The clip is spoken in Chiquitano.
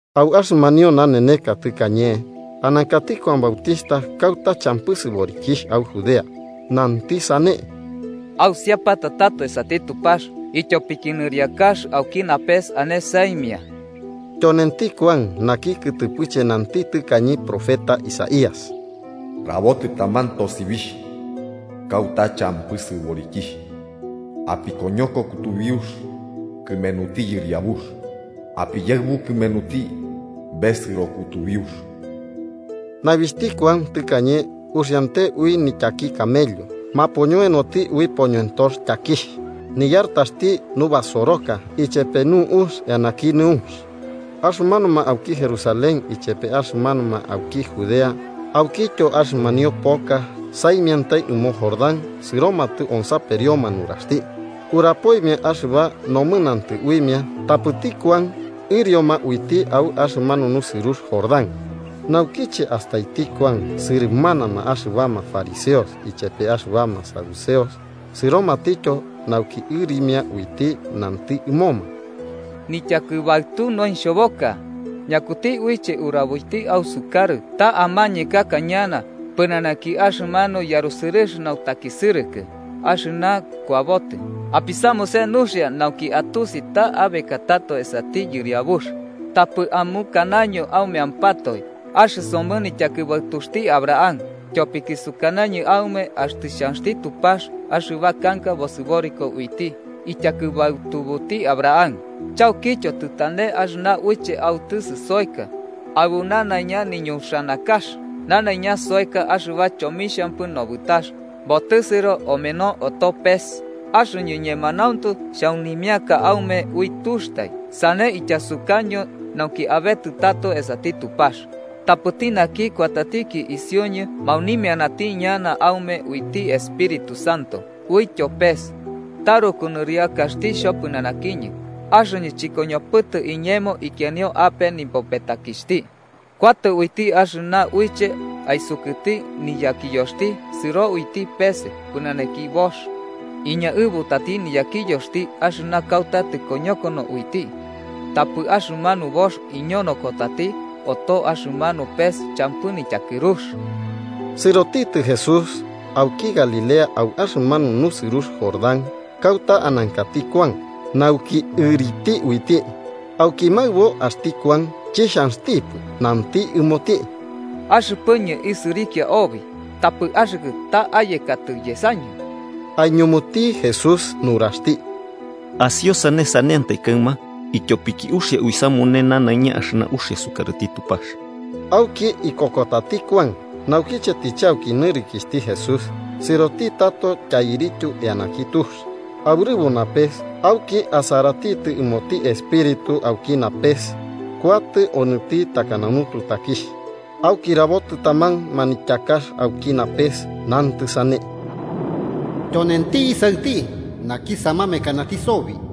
Au axɨmanio naneneka tɨkañe anankati Kuan Bautixhta kauta champɨ sɨborikixh au Judea. Nanti sane: “¡Ausiapata tato esati Tupax, ityopiki nɨriakax auki napes ane saimia!” Tyonenti Kuan naki kɨtɨpɨche nanti tɨkañe profeta Isaías: “Rabotɨ taman tosibixh kauta champɨ sɨborikixh: ‘Apikoñoko kutubiux kɨmenuti Yɨriabux. Apiyaɨbu kɨmenuti besɨro kutubiux.’” Naibixhti Kuan tɨkañe uxiante ui nityaki camello, mapoñoenoti ui poñoentox tyakixh. Niyartaxti nubasoroka ichepe nu'ux eanaki nɨunx. Axɨmanuma auki Jerusalén ichepe axɨmanuma auki Judea aukityo axɨmanio poka saimiantai ɨmo Jordán sɨromatɨ onsaperioma nuraxti. Urapoimia axɨba nomɨnantɨ uimia tapɨti Kuan ɨrioma uiti au axɨmanu nusɨrux Jordán. Naukiche astaiti Kuan sɨrɨmanama axɨbama fariseos ichepe axɨbama saduceos sɨromatityo nauki ɨrimia uiti, nanti ɨmoma: “¡Nityakɨbaɨtu noixhoboka! ¿Ñakuti uiche uraboiti ausukarɨ ta amañekaka ñana pɨnanaki axɨmanu yarusɨrɨx nautakisɨrɨkɨ axɨna kuabotɨ? Apisamuse nuxia nauki atusi ta abekatato esati Yɨriabux, tapɨ amukanaño aumeampatoe: ‘Axɨsomɨ nityakɨbaɨtuxti Abraham.’ Tyopiki sukanañɨ aume axtɨ xhanxti Tupax axɨba kanka bosɨboriko uiti ityakɨbaɨtubuti Abraham. Chaukityo, tɨtane axɨna uiche autɨsɨ soeka aɨbu nanaiña niñuxanakax. Nanaiña soeka axɨba chomixhampɨ nobɨtakax, botɨsɨro omeno oto pes. Axɨñɨ, ñemanauntu, xhaunimiaka aume ui tuxtai, sane ityasukaño nauki abetɨ tato esati Tupax. Tapɨti naki kuatatiki isiuñɨ maunimianati ñana aume uiti Espíritu Santo uityo pes. Taruku nɨriakaxti xhopɨnanakiñɨ, axɨñɨ chɨkoñopɨtɨ iñemo ikianio ape nipopetakixhti. Kuatɨ uiti axɨna uiche aisukɨti niyakiyoxti sɨro uiti peese pɨnanaki boox. Iñaɨbutati niyakiyoxti axɨna kauta tɨkoñokono uiti, tapɨ axɨmanu boox iñonokotati oto axɨmanu pes champɨ nityakɨrux.” Sɨrotitɨ Jesús auki Galilea au axɨmanu nusɨrux Jordán, kauta anankati Kuan, nauki ɨriti uiti. Auki maɨbo axti Kuan chixhanxtipɨ, nanti ɨmoti: –Axɨpɨñɨ isɨrikia obi, ¿tapɨ axɨkɨ ta ayekatɨ yesañɨ? Aiñumuti Jesús nuraxti: –Asiosane saneantai kaɨma, ityopiki uxia uisamune nanaiña axɨna uxia sukarɨti Tupax. Auki ikokotati Kuan. Naukiche tɨchauki nɨrikixhti Jesús sɨrotitɨ tato tyairityu eanaki tux, aurɨbo napes auki asaratitɨ ɨmoti Espíritu auki napes kuatɨ onɨti takana nututakixh. Auki rabotɨ taman manityakax auki napes, nantɨ sane: “Tyonenti Isaɨti, naki samamekanati sobi.”